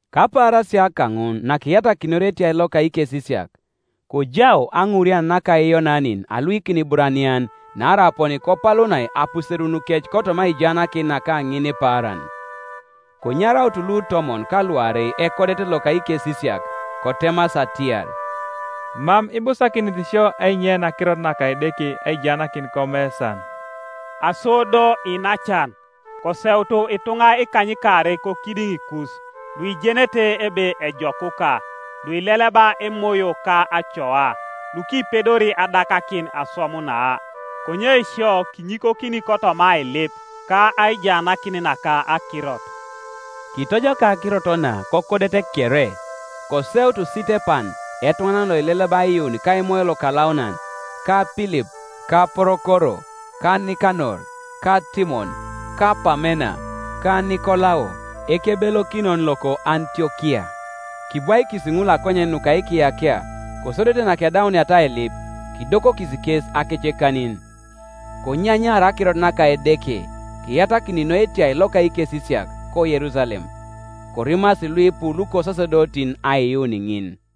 Kapaarasia kaŋun nakiyatakinor etiai loka ikesisiak, kojau aŋuurian naka Iyonanin aluikin Iburanian naarai aponi kopalunai apuserunukec kotoma aijaanakin naka ŋinipaaran. Konyaraut lutomon ka luarei ekodet ŋol loka ikesisiak, kotemasi atiar, “Mam ibusakinit sio ainyein akirot naka Edeke aijaanakin komesan. Aso do, iinacan, koseutu ituŋa ikanykaarei kokidiŋikus, luijenete ebe ejokuka, luileleba Emoyo ka acoa, lukipedori adakakin oswam na. Konye sio kinyikokini kotoma ailip ka aijaanakin naka akirot.” Kitojokai akirot na kokodet kere, koseut Sitepan etuŋanan loileleba aiyuun ka Emoyo Lokalaunan, ka Pilip, ka Porokoro, ka Nikanor, ka Timon, ka Pamena, ka Nikolao, ekebelokinon loko Antiokia. Kibwaikis ŋul akonyen nuka ikiyakia, kosodete nakedauniata ailip, kidokokis kes akecekanin. Konyanyaar akirot naka Edeke; kiyatakin noi etiai loka ikesisiak ko Yerusalem, korimasi luipu lukosasedotin aiyuun ŋin.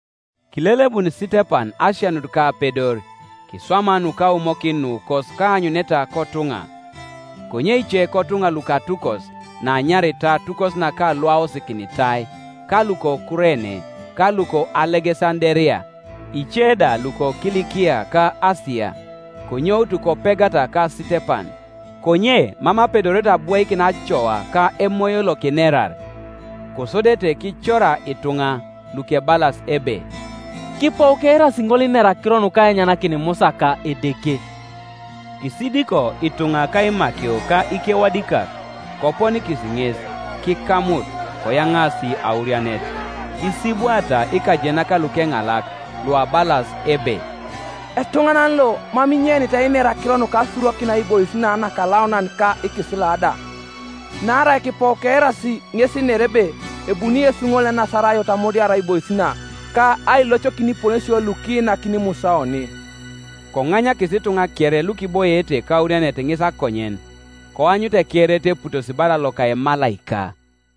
Kilelebun Sitepan asianut ka apedor, kiswama nukaumokin nukos ka aanyuneta kotuŋa, Konye ice kotuŋa lukatukos naanyaritai atukos naka Luaosikinitai, ka luko Kurene, ka luko Alegesanderia, ice da lukoKilikia ka Asia, konyoutu kopegata ka Sitepan. Konye mam apedorete abwoikin acoa ka Emoyo lokinerar. Kosodete kicora ituŋa, lukebalas ebe, “Kipou keirasi ŋol inera akiro nukainyanakin Musa ka Edeke.” Kisidiko ituŋa ka imakio ka ikewadikak, koponikis ŋes, kikamut, koyaŋaasi aurianet, kisibwaata ikajenak lukeŋalak luabalas ebe, “Etuŋanan lo mam inyeinit einer akiro nuka asurokin aibois na nakalaunan ka ikisila da; naarai kipou keirasi ŋes inera ebe ebuni Yesu ŋol Enasarayot amudiar aibois na, ka ailocokin iponesio lukiinakini Musa oni.” Koŋanyakis ituŋa kere lukiboiete kaurianet ŋes akonyen, koanyut ekereet eputosi bala loka emalaika.